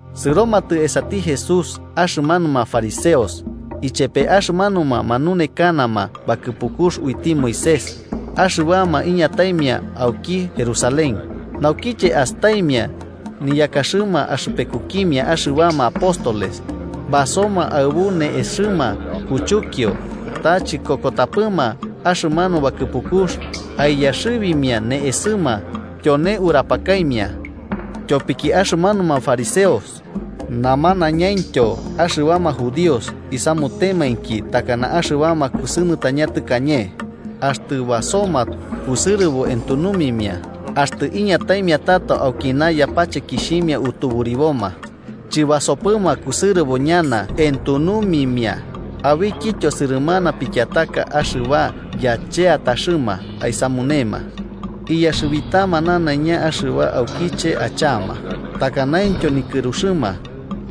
Sɨromatɨ esati Jesús axɨmanuma fariseos, ichepe axɨmanuma manunekanama bakɨpukux uiti Moisés axɨbama iñataimia auki Jerusalén. Naukiche astaimia niyakaxɨma axɨpekukimia axɨbama apóstoles basoma aɨbu ne'esɨma kuchukio, ta chikokotapɨma axɨmanu bakɨpukux aiyaxɨbimia ne'esɨma, tyone urapakaimia. (Tyopiki axɨmanuma fariseos namanañamaintyo axɨbama Judíos isamutemainki takana axɨbama kusɨnɨtaña tɨkañe, axtɨ basoma kusɨrɨbo entunumimia. Axtɨ iñataimia tato aukina yapachekixhimia utuburiboma, chɨbasopɨma kusɨrɨbo ñana entunumimia. Abikityo sɨrɨmana pikiataka axɨba yacheataxɨma aisamunema, iyaxɨbitama nanaiña axɨba aukiche achama, takanaityo nikɨruxɨma.)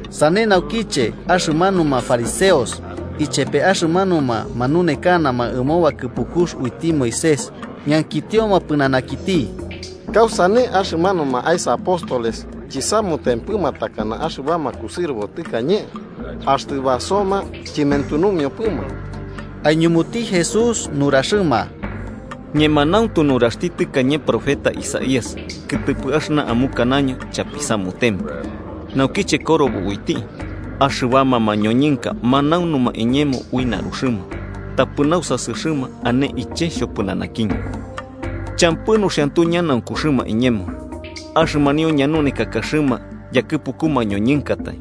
Sane naukiche, axɨmanuma fariseos ichepe axɨmanuma manunekanama ɨmo bakɨpukux uiti Moisés ñankitioma pɨnanakiti: –¿Kausane axɨmanuma aesa apóstoles chisamutempɨma takana axɨbama kusɨrɨbo tɨkañe, axtɨ basoma chɨmentunumiopɨma? Aiñumuti Jesús nuraxɨma: –Ñemanauntu nuraxti tɨkañe profeta Isaías kɨtɨpɨ axɨna amukanaño chapisamutempɨ, naukiche korobo uiti: ‘Axɨbama mañoñɨnka manaunuma iñemo ui naruxɨma, tapɨ nausasɨxɨma ane iche xhopɨnanakiñɨ. Champɨ nuxiantu ñanaunkuxɨma iñemo: axɨmanio ñanunekakaxɨma yakɨpuku mañoñɨnkatai.’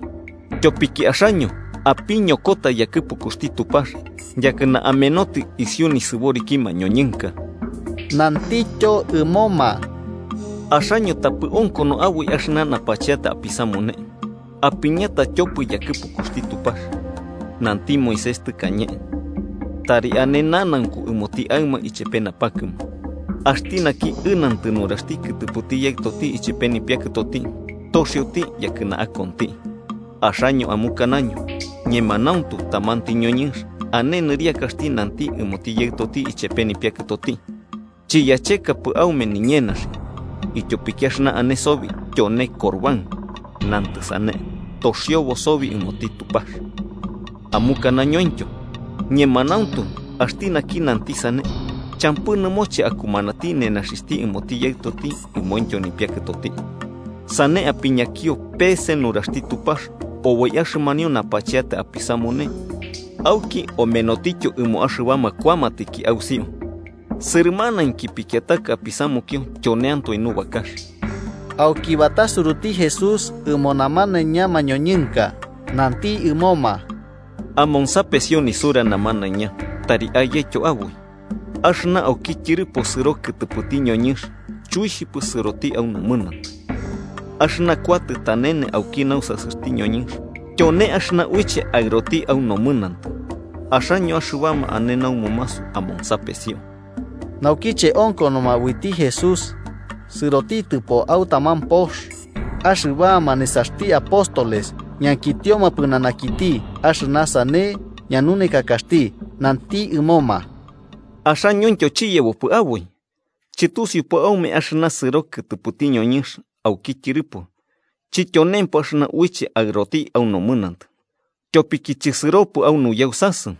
Tyopiki axaño apiñokota yakɨpukuxti Tupax, yakɨna amenotɨ isiu nisɨboriki mañoñɨnka. Nantityo ɨmoma: –Axaño tapɨ onkono aboi axɨna napacheata apisamune, apiñata tyopɨ yakɨpukuxti Tupax. Nanti Moisés tɨkane: ‘Tari ane nanaunku ɨmoti aɨma ichepe napakɨma’, ‘Axti naki ɨnantɨ nuraxti kɨtɨpɨti yaɨtoti ichepe nipiakɨtoti, toxioti yakɨna akonti.’ Axaño amukanaño ñemanauntu tamanti ñoñɨnx ane nɨriakaxti nanti ɨmoti yaɨtoti ichepe nipiakɨtoti: ‘Chiyachekapɨ aume niñenaxi, ityopiki axɨna ane sobi tyone corbán’ (nantɨ sane: “toxiobo sobi ɨmoti Tupax.”) Amukanañointyo ñemanauntu axti naki nanti sane champɨ nɨmoche akumanati nenaxixhti ɨmoti yaɨtoti ɨmointyo nipiakɨtoti. Sane apiñakio pe'ese nuraxti Tupax oboi axɨmanio napacheata apisamune auki omenotityo ɨmo axɨbama kuamatiki ausiu. Sɨrɨmanainki pikiataka apisamukio tyoneantoe nubakax. Auki batasuruti Jesús ɨmo namanaiña mañoñɨnka, nanti ɨmoma: –Amonsapesio nisura namanaiña, tari ayetyo aboi: Axɨna auki tyɨrɨpo sɨro kɨtɨpɨti ñoñɨnx chuixhipɨ sɨroti au nomɨnantɨ. Axɨna kuatɨ tanene auki nausasɨxti ñoñɨnx tyone axɨna uiche aɨroti au nomɨnantɨ. Axaño axɨbama ane namumasu amonsapesio. Naukiche onkonoma uiti Jesús sɨrotitɨpo au taman pox, axɨbama nesaxti apóstoles ñankitioma pɨnanakiti axɨna sane ñanunekakaxti. Nanti ɨmoma: –¿Axañointyo chiyebopɨ aboi? ¿Chɨtusiupɨ aume axɨna sɨro kɨtɨpɨti ñoñɨnx auki tyɨrɨpo chityonempɨ axɨna uiche aɨroti au nomɨnantɨ, tyopiki chɨsɨropɨ au nuyausasɨ,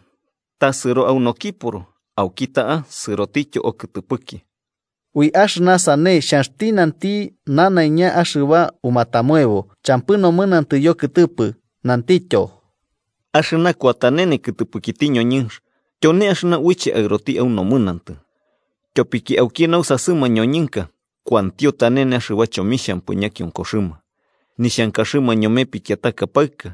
ta sɨro au nokiporo auki ta'a sɨrotityo okɨtɨpɨki? Ui axɨna sane xhanxti nanti nanaiña axɨba umatamoebo champɨ nomɨnantɨ yokɨtɨpɨ. Nantityo: –Axɨna kuatanene kɨtɨpɨkiti ñoñɨnx, tyone axɨna uiche aɨroti au nomɨnantɨ. Tyopiki auki nausasɨ mañoñɨnka, kuantio tanene axɨba chomixhampɨ ñakionkoxɨma, nixhankaxɨma ñome pikiataka paɨka,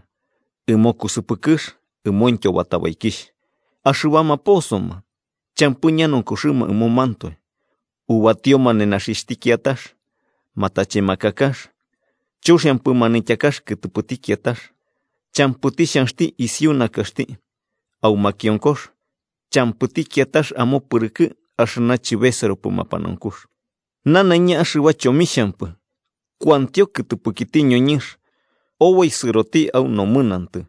ɨmo kusɨpɨkɨx ɨmointyo batabaikixh, axɨbama posoma champɨ ñanaunkuxɨma ɨmomantoe, ubatioma nenaxixhti kiatax, matachemakakax, chuxiampɨ manityakax kɨtɨpɨti kiatax, champɨti xhanx isu nakaxti, au makionkox champɨti kiatax amopɨrɨkɨ axɨna chɨbesɨropɨ mapanaunkux. Nanaiña axɨba chomixhampɨ kuantio kɨtɨpɨkiti ñoñɨnx oboi sɨroti au nomɨnantɨ.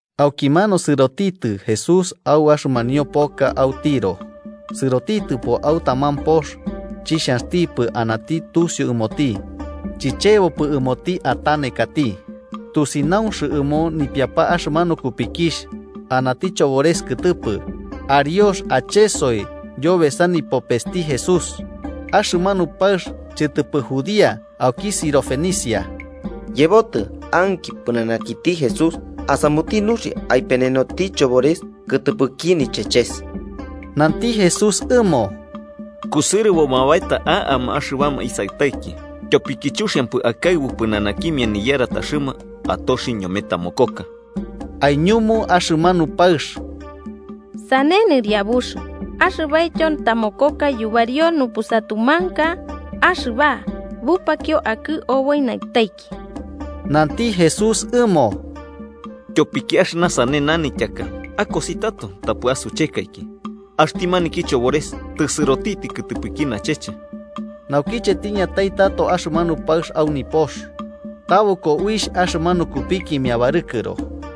Aukimanu sɨrotitɨ Jesús au axɨmanio poka au Tiro. Sɨrotitɨpo au taman pox, chixhanxtipɨ anati tusiu ɨmoti. Chichebopɨ ɨmoti atanekati. Tusinaunx ɨmo nipiapa axɨmanu kupikixh anati chobores kɨtɨpɨ, ariox achesoi yobesa nipopesti Jesús. Axɨmanu paɨx chɨtɨpɨ judía, auki Sirofenicia. Yebotɨ, anki pɨnanakiti Jesús asamuti nuxia aipenenoti chobores kɨtɨpɨki nicheches. Nanti Jesús ɨmo: –Kusɨrɨboma baeta a'ama axɨbama isaɨtaiki, tyopiki chuxiampɨ akaɨbu pɨnanakimia niyarataxɨma atoxi ñome tamokoka. Aiñumu axɨmanu paɨx: –Sane, Nɨriabux, axɨbaityo tamokoka yubario nupusatumanka axɨba bupakio akɨ oboi naɨtaiki. Nanti Jesús ɨmo: –Tyopiki axɨna sane nanityaka, akosi tato tapɨ asuchekaiki. Axti maniki chobores tɨsɨrotitɨ kɨtɨpɨki nacheche. Naukiche tiñatai tato axɨmanu paɨx au nipox, tabɨko uixh axɨmanu kupikimia barɨkɨro.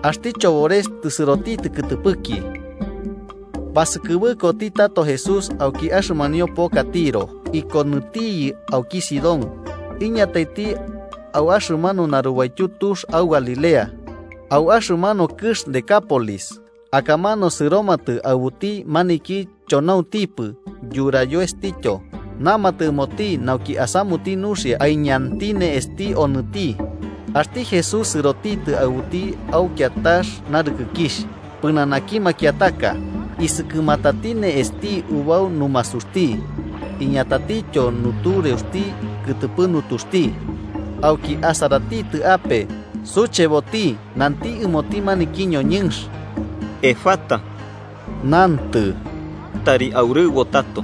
Axti chobores tɨsɨrotitɨ kɨtɨpɨki. Basɨkɨbɨkoti tato Jesús auki axɨmanio poka Tiro, ikɨnotiyɨ auki Sidón, iñataiti au axɨmanu narubaityu tux au Galilea, au axɨmanu kɨx Decápolis. Akamanu sɨromatɨ aɨbuti maniki chonauntipɨ yurayoestityo, namatɨ ɨmoti nauki asamuti nuxia aiñanti ne'esti onɨti. Axti Jesús sɨrotitɨ aɨbuti au kiatax narɨkɨkixh, pɨnanaki makiataka, isɨkɨmatati ne'esti ubau numasuxti iñatatityo nutureuxti kɨtɨpɨ nutuxti. Auki, asaratitɨ ape, sucheboti, nanti ɨmoti maniki ñoñɨnx: “¡Efatá!” (nantɨ: “¡Tari aurɨbo tato!”)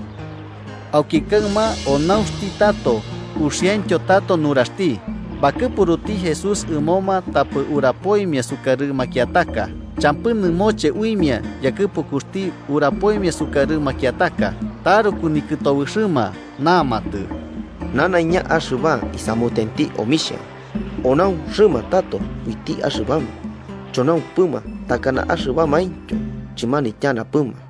Auki kaɨma onaunxti tato, uxiaintyo tato nuraxti. Bakɨpuruti Jesús ɨmoma tapɨ urapoimia sukarɨ makiataka. Champɨ nɨmoche uimia yakɨpukuxti urapoimia sukarɨ makiataka. Taruku nikɨtobɨxɨma, namatɨ: “Nanaiña axɨba isamutenti omixhia. ¡Onaunxɨma tato uiti axɨbama chonaumpɨma takana axɨbamaintyo chɨmanityanapɨma!”